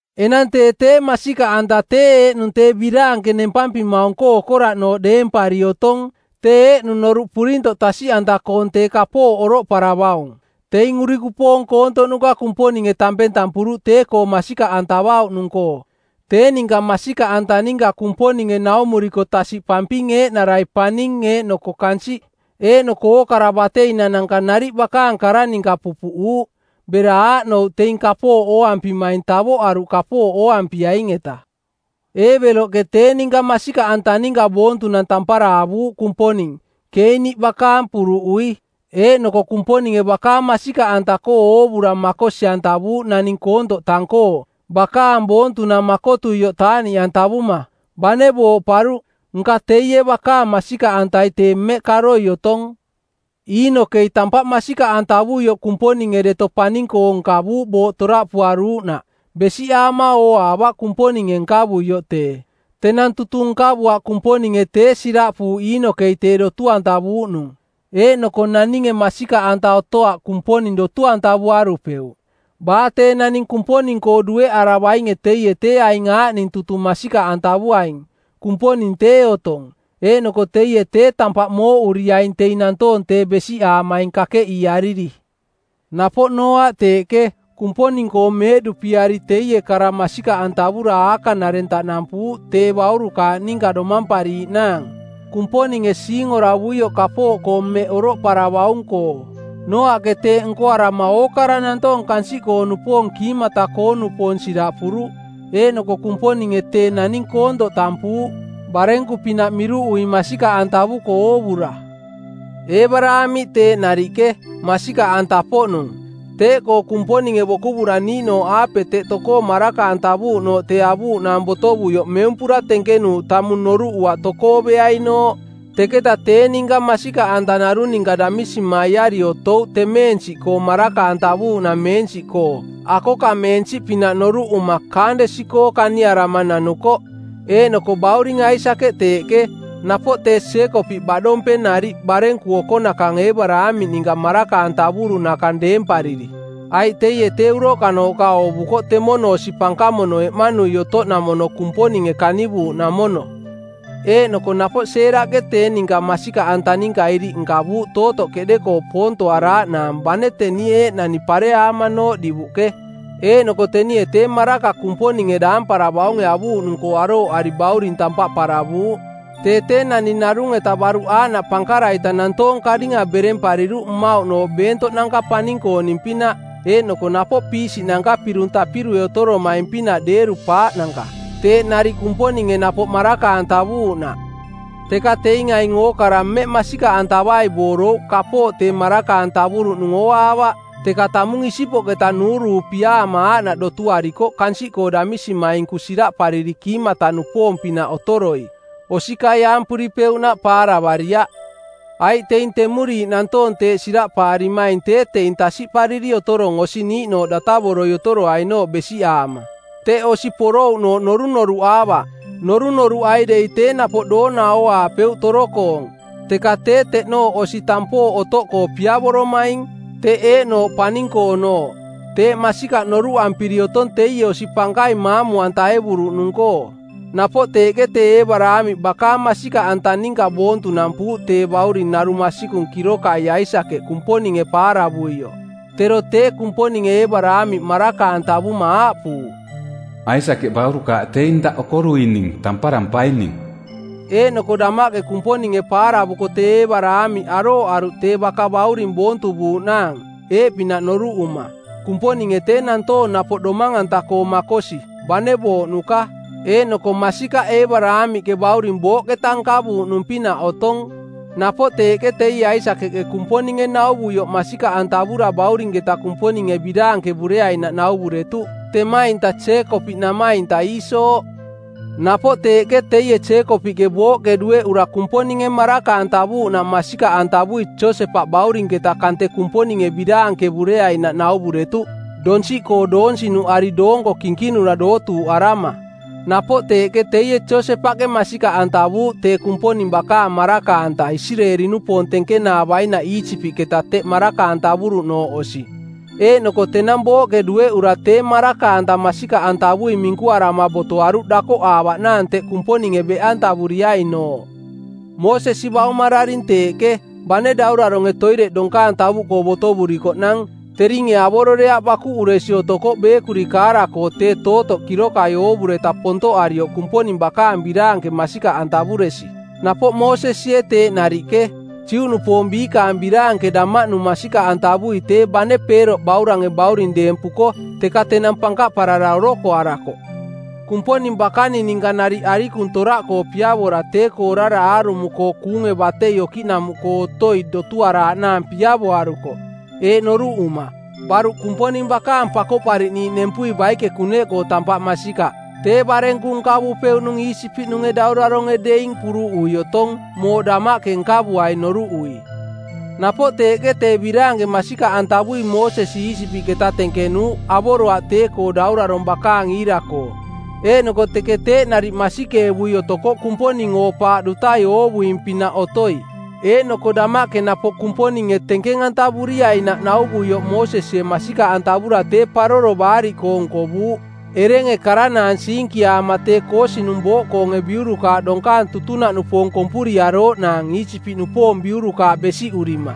Enang tee tee masikaꞌanta tee eeꞌnung tee biraanke nempampimaung-koo okoraꞌnooꞌ deempari otong, tee eeꞌnung noruꞌ purintoꞌ tasiꞌanta-koong tee kapooꞌ oroꞌparavaung. Teing urikupoong koontoꞌnuka Kumponinge tampeng tampuruꞌ tee-koo masikaꞌantavauꞌnung-koo. Tee ninka masikaꞌanta ninka Kumponinge naumuriko tasiꞌpamping eeꞌnarai paning eeꞌnoko kansiꞌ eeꞌnoko ookara bateinananka nariꞌ bakaang kara ninka pupuꞌuuꞌ, bera aaꞌnouꞌ teing kapooꞌ ooampimaing tavoꞌaruꞌ kapooꞌ ooampiaing-eta. Eebeloꞌke tee ninka masikaꞌanta ninka boontunang tampara avuuꞌ Kumponing, Keeni bakaang puruꞌui. Eeꞌnoko Kumponinge bakaang masikaꞌanta-koo oovura makosi-antavuuꞌ naning koontoꞌ tang-koo, bakaang boontunang makotuioꞌ taaꞌniꞌantavuma. Bane booꞌparuꞌ, nka teie bakaang masikaꞌantai tee mmeꞌ karoi otong. Iinokei tampaꞌ masikaꞌantavuioꞌ Kumponinge deto paning-koo nkavuuꞌ booꞌ toraꞌpuaruuꞌnaꞌ. Besiꞌaama ooaavaꞌ Kumponinge nkavuioꞌ tee. Tenang tutung nkavuaꞌ Kumponinge tee siraꞌpuuꞌ Iinokei tee dotu-antavuuꞌnung. Eeꞌnoko naninge masikaꞌanta otoaꞌ Kumponing dotu-antavuarupeuꞌ. Baa tee naning Kumponing-koo dueꞌaravainge teie tee aing aaꞌning tutung masikaꞌantavuaing: Kumponing tee otong, eeꞌnoko teie tee tampaꞌ mooꞌuriaing teing nantoong tee besiꞌaamaing kakeꞌiiariri. Napoꞌ Nooaꞌ teeꞌke, Kumponing-koo meeꞌduꞌpiari teie kara masikaꞌantavura aakaꞌnareng taꞌnampuuꞌ tee baurukaaꞌ ninka domampariiꞌnaang, Kumponinge siingoravuioꞌ kapooꞌkoo mmeꞌ oroꞌparavaung-koo. Nooaꞌke teeꞌ nkoarama ookara nantoong kansiꞌkoo-nupoong kiimata-koo-nupoong siraꞌpuruꞌ. Eeꞌnoko Kumponinge tee naning koontoꞌ tampuuꞌ, barenku-pinaꞌ miruꞌui masikaꞌantavuko oovura. Eebaraamiꞌ teeꞌ nariꞌke, masikaꞌanta-poꞌnung. Teeꞌkoo Kumponinge bokuvura niiꞌnooꞌaape teꞌ tokoo maraka-antavuuꞌnooꞌ tee avuuꞌnaang botovuioꞌ meumpura tenkenuuꞌ tamung noruꞌuaꞌ tokoo beainooꞌ. Teketa tee ninka masikaꞌanta narung ninka damisimaiari otouꞌ temeensiꞌkoo maraka-antavuuꞌnameensiꞌkoo, akokameensiꞌpinaꞌ noruꞌuma, kaandesi-koo kaniarama nanukoꞌ. Eeꞌnoko bauring Aisakeꞌ teeꞌke, napoꞌ tee Jeekopiꞌ baꞌdompeng nariꞌ barenku okonakang Eebaraamiꞌ ninka maraka-antavuruꞌnakang deempariri. Aiꞌ teie tee uroꞌkanooꞌka oovukoꞌ temono osi pankamono eꞌmanui otoꞌnamono Kumponinge kanivuuꞌnamono. Eeꞌnoko napoꞌ Seeraꞌke tee ninka masikaꞌanta ninka iriꞌ nkavuuꞌ tootoꞌ keꞌde-koo poontoaraaꞌnaang bane teni eeꞌnani pareaamanooꞌ divuꞌke, eeꞌnoko tenie tee maraka Kumponinge daamparavaunge avuuꞌnung-koo arooꞌari bauring tampaꞌ paravuuꞌ. Tee tee naning narung-eta baruꞌ aaꞌnaꞌ pankara-ita nantoong karinga berempariruꞌ mmauꞌnooꞌ beentoꞌnanka paning-kooning-pinaꞌ, eeꞌnoko napoꞌ piisiꞌnanka pirung tapirue otoromaing-pinaꞌ deeru-paaꞌnanka, teeꞌ nariꞌ Kumponinge napoꞌ maraka-antavuuꞌnaꞌ. Teka teing aing ookara mmeꞌ masikaꞌantavai boorouꞌ kapooꞌ tee maraka-antavuruꞌnung ooaavaꞌ, teka tamung isipoꞌketa nuuruupiaama aaꞌnaꞌ dotuarikoꞌ kansiꞌkoo damisimainku siraꞌpariri kiimata-nupoong-pinaꞌ otoroi, osikaiaampuripeuꞌnaꞌ paaravariaꞌ. Aiꞌ teing temuriiꞌ nantoong teeꞌ siraꞌpaarimaing tee teing tasiꞌpariri otorong osi niiꞌnooꞌ datavoroi otoroainooꞌ besiꞌaama. Teꞌ osi porouꞌnooꞌ norunoruꞌaavaꞌ. Norunoruꞌai dei tee napoꞌ doona ooaapeuꞌ toro-koong. Teka tee teꞌnooꞌ osi tampooꞌ otoꞌkoo piavoromaing, teꞌ eeꞌnooꞌ paning-koonooꞌ. Teeꞌ masikaꞌ noruꞌampiri otong teie osi pankaing maamu-antaevuruꞌnung-koo. Napoꞌ teeꞌke tee Eebaraamiꞌ bakaang masikaꞌanta ninka boontunampuuꞌ tee bauring narung masikung kirokai Aisakeꞌ Kumponinge paaravuioꞌ; Tero tee Kumponinge Eebaraamiꞌ maraka-antavuma aaꞌpuuꞌ, “Aisakeꞌ baurukaaꞌ teing daꞌ okoruining tamparampaining.” Eeꞌnoko damaꞌke Kumponinge paaravuko tee Eebaraamiꞌ arooꞌaruꞌ tee baka bauring boontuvuuꞌnaang, eeꞌpinaꞌ noruꞌuma, “Kumponinge tee nantoong napoꞌ domang-anta-koo makosi, bane booꞌnuka.” Eeꞌnoko masikaꞌ Eebaraamiꞌke bauring booꞌketa nkavuuꞌnung-pinaꞌ otong. Napoꞌ teeꞌke teie Aisakeꞌke Kumponinge nauvuioꞌ masikaꞌantavura baurinketa Kumponinge biraankevureainaꞌ nauvuretuꞌ, temainta Jeekopiꞌ namainta Iiso. Napoꞌ teeꞌke teie Jeekopiꞌke booꞌke dueꞌura Kumponinge maraka-antavuuꞌnaꞌ masikaꞌantavui Josepaꞌ baurinketa kante Kumponinge biraankevureainaꞌ nauvuretuꞌ, donsiꞌkoo doonsinuꞌari doonko kinkinura dootuuꞌarama. Napoꞌ teeꞌke teie Josepaꞌke masikaꞌantavuuꞌ tee Kumponing bakaang maraka-anta Isireeli-nupoong tenkenaavainaꞌ Iisipiꞌketa teꞌ maraka-antavuruꞌnooꞌ osi, eeꞌnoko tenang booꞌke dueꞌura tee maraka-anta masikaꞌantavui minkuarama botoaruꞌ dakoꞌaavaꞌnaang teꞌ Kumponinge beꞌantavuriainooꞌ. Moosesi baumararing teeꞌke, bane dauraronge˜ toireꞌ donkaang tavuꞌkoo botovurikoꞌnang teringe avororeaꞌ bakuꞌuresi otokoꞌ beekuri kaara-koo tee tootoꞌ kirokai oovureta pontoꞌarioꞌ Kumponing bakaang biraanke masikaꞌantavuresi. Napoꞌ Moosesie teeꞌ nariꞌke, Juꞌnupoong biikaang biraanke damaꞌnung masikaꞌantavui tee bane Peeroꞌ baurange bauring deempuko, teka tenang pankaꞌparara orokoarakoꞌ. Kumponing bakaning ninka nariꞌ arikung toraꞌkoo piavora tee-koo orara aarumo-koo kuunge batei okiꞌnamuꞌkoo otoi dotuaraaꞌnaang piavoarukoꞌ, eeꞌ noruꞌuma: baruꞌ Kumponing bakaang Pakoꞌpariꞌniiꞌ nempui baike kuneꞌkoo tampaꞌ masikaꞌ tee barenku nkavupeuꞌnung Iisipiꞌnunge dauraronge deing puruꞌui otong mooꞌ damaꞌke nkavuaing noruꞌui. Napoꞌ teeꞌke tee biraanke masikaꞌantavui Moosesi Iisipiꞌketa tenkenuuꞌ avoroaꞌ tee-koo daurarong bakaang iira-koo, eeꞌnoko teke teeꞌ nariꞌ masikeevui otokoꞌ Kumponing oo-paaꞌ dutai oovuing-pinaꞌ otoi. Eeꞌnoko damaꞌke napoꞌ Kumponinge tenkeng-antavuriainaꞌ nauvuioꞌ Moosesie masikaꞌantavura tee Paroro Baariꞌkoong˜ nkovuuꞌ erenge karanaang siinkiaama tee koosinung˜ booꞌkoonge biurukaaꞌ donkaang tutunaꞌnupoong kompuriarooꞌnaang Iisipiꞌnupoong biurukaaꞌ besiꞌurima.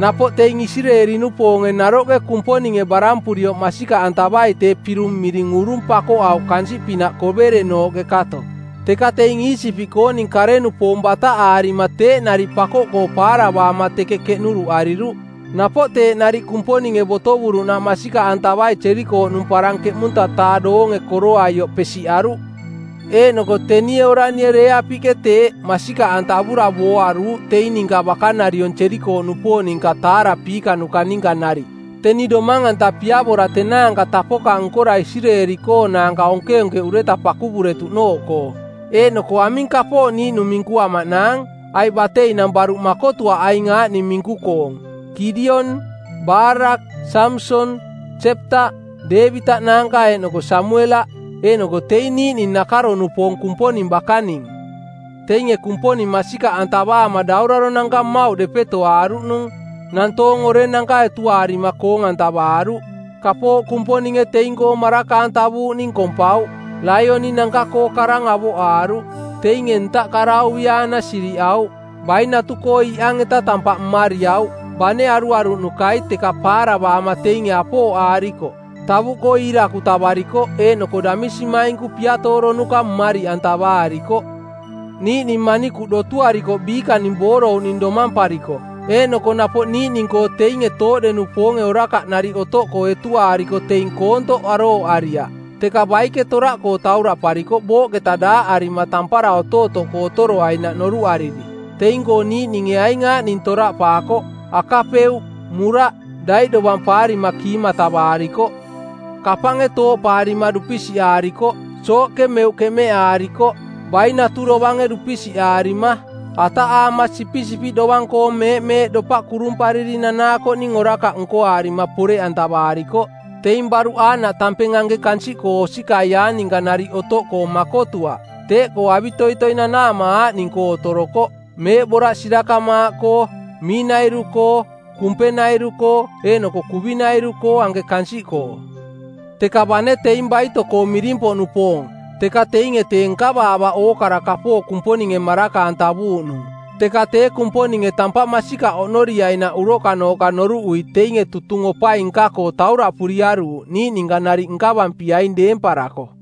Napoꞌ teing Isireeli-nupoonge naroꞌke Kumponinge barampurioꞌ masikaꞌantavai tee pirung miring Urung pakoꞌauꞌ kansiꞌpinaꞌ koverenooꞌke kato, teka teing Iisipiꞌkooning kare-nupoong bataꞌaarima teeꞌ nariꞌ pakoꞌkoo paaravaama teke keꞌnuruꞌariruꞌ. Napoꞌ teeꞌ nariꞌ Kumponinge botovuruꞌnaꞌ masikaꞌantavai Jerikooꞌnung parang ˜keꞌmunta-taa doonge koroaioꞌ pesiꞌaruꞌ. Eeꞌnoko tenie oranie Reeapiꞌke teeꞌ, masikaꞌantavura booaruuꞌ teing ninka bakanariong Jerikooꞌnupoong ninka taarapiikanuka ninka nariꞌ, teni domang-anta piavora tenaanka tapoka nkora Isireeli-koonaanka onkeonkeꞌureta pakuvuretuꞌnooꞌkoo. Eeꞌnoko aming kapooꞌ niiꞌnung minkuamaꞌnaang? Aiꞌ bateinang baruꞌ makotuaꞌ aing aaꞌning minku-koong: Kidion, Barak, Samson, Jeptaꞌ, Deevitaꞌ naanka eeꞌnoko Samuelaꞌ, eeꞌnoko teing niiꞌning nakaro-nupoong˜ Kumponing bakaning. Teinge Kumponing masikaꞌantavaama dauraronanka mmauꞌ depetoaaruꞌnung, nantoong orenanka etuaarima koong-antavaaruꞌ. Kapooꞌ Kumponinge teing-koo maraka-antavuuꞌning kompauꞌ. Laioni-nanka-koo karang avoꞌaaruꞌ. Teinge ntaꞌ karauviaana sirivaaꞌauꞌ. Bainatu-koo iꞌang-eta tampaꞌ mmariauꞌ. Bane aruaruꞌnukai teka paaravaama teinge apooꞌaarikoꞌ. Tavuꞌkoo iirakutavarikoꞌ eeꞌnoko damisimainku piatooronuka˜ mmariꞌantavaarikoꞌ. Niiꞌning manikuꞌ dotuarikoꞌ biikaning boorouꞌning domampariko. Eeꞌnoko napoꞌ niiꞌning-koo teinge tooꞌde-nupoonge orakaꞌ nariꞌ otoꞌkoo etuaariko teing koontoꞌ arooꞌariaꞌ, teka baike toraꞌkoo tauraꞌparikoꞌ booꞌketa daaꞌarima tampara otootoꞌkoo otoroainaꞌ noruꞌariri. Teing-koo niiꞌninge aing aaꞌning toraꞌpaakoꞌ: akapeuꞌ, muraꞌ, daiꞌdovampaarima kiimatavaarikoꞌ. Kapange tooꞌpaarima dupisiꞌaarikoꞌ, sooꞌke meuꞌ keꞌmeꞌaarikoꞌ, bainatu dovange dupisiꞌaarima. Ataꞌaama sipisipiꞌ dovang-koong meeꞌmeeꞌ dopaꞌ kurumpariri nanaakoꞌning orakaꞌ nkoaarima poreꞌantavaarikoꞌ. Teing baruꞌ aaꞌnaꞌ tampeng anke kansiꞌkoo osikaiaang ninka nariꞌ otoꞌkoo, makotuaꞌ. Teeꞌkoo avitoitoi nanaama aaꞌning-koo otorokoꞌ: meeꞌboraꞌ sirakamaaꞌkoo, miinairu-koo, kumpenairu-koo eeꞌnoko kuvinairu-koo anke kansiꞌkoo. Teka bane teing baito-koo miring-poꞌnupoong, teka teinge tee nkavaavaꞌ ookara kapooꞌ Kumponinge maraka-antavuuꞌnung. Teka tee Kumponinge tampaꞌ masikaꞌ oꞌnoriainaꞌ uroꞌkanooꞌka noruꞌui teinge tutung opai nka-koo tauraꞌpuriaruuꞌ niiꞌ ninka nariꞌ nkavampiaing deemparako.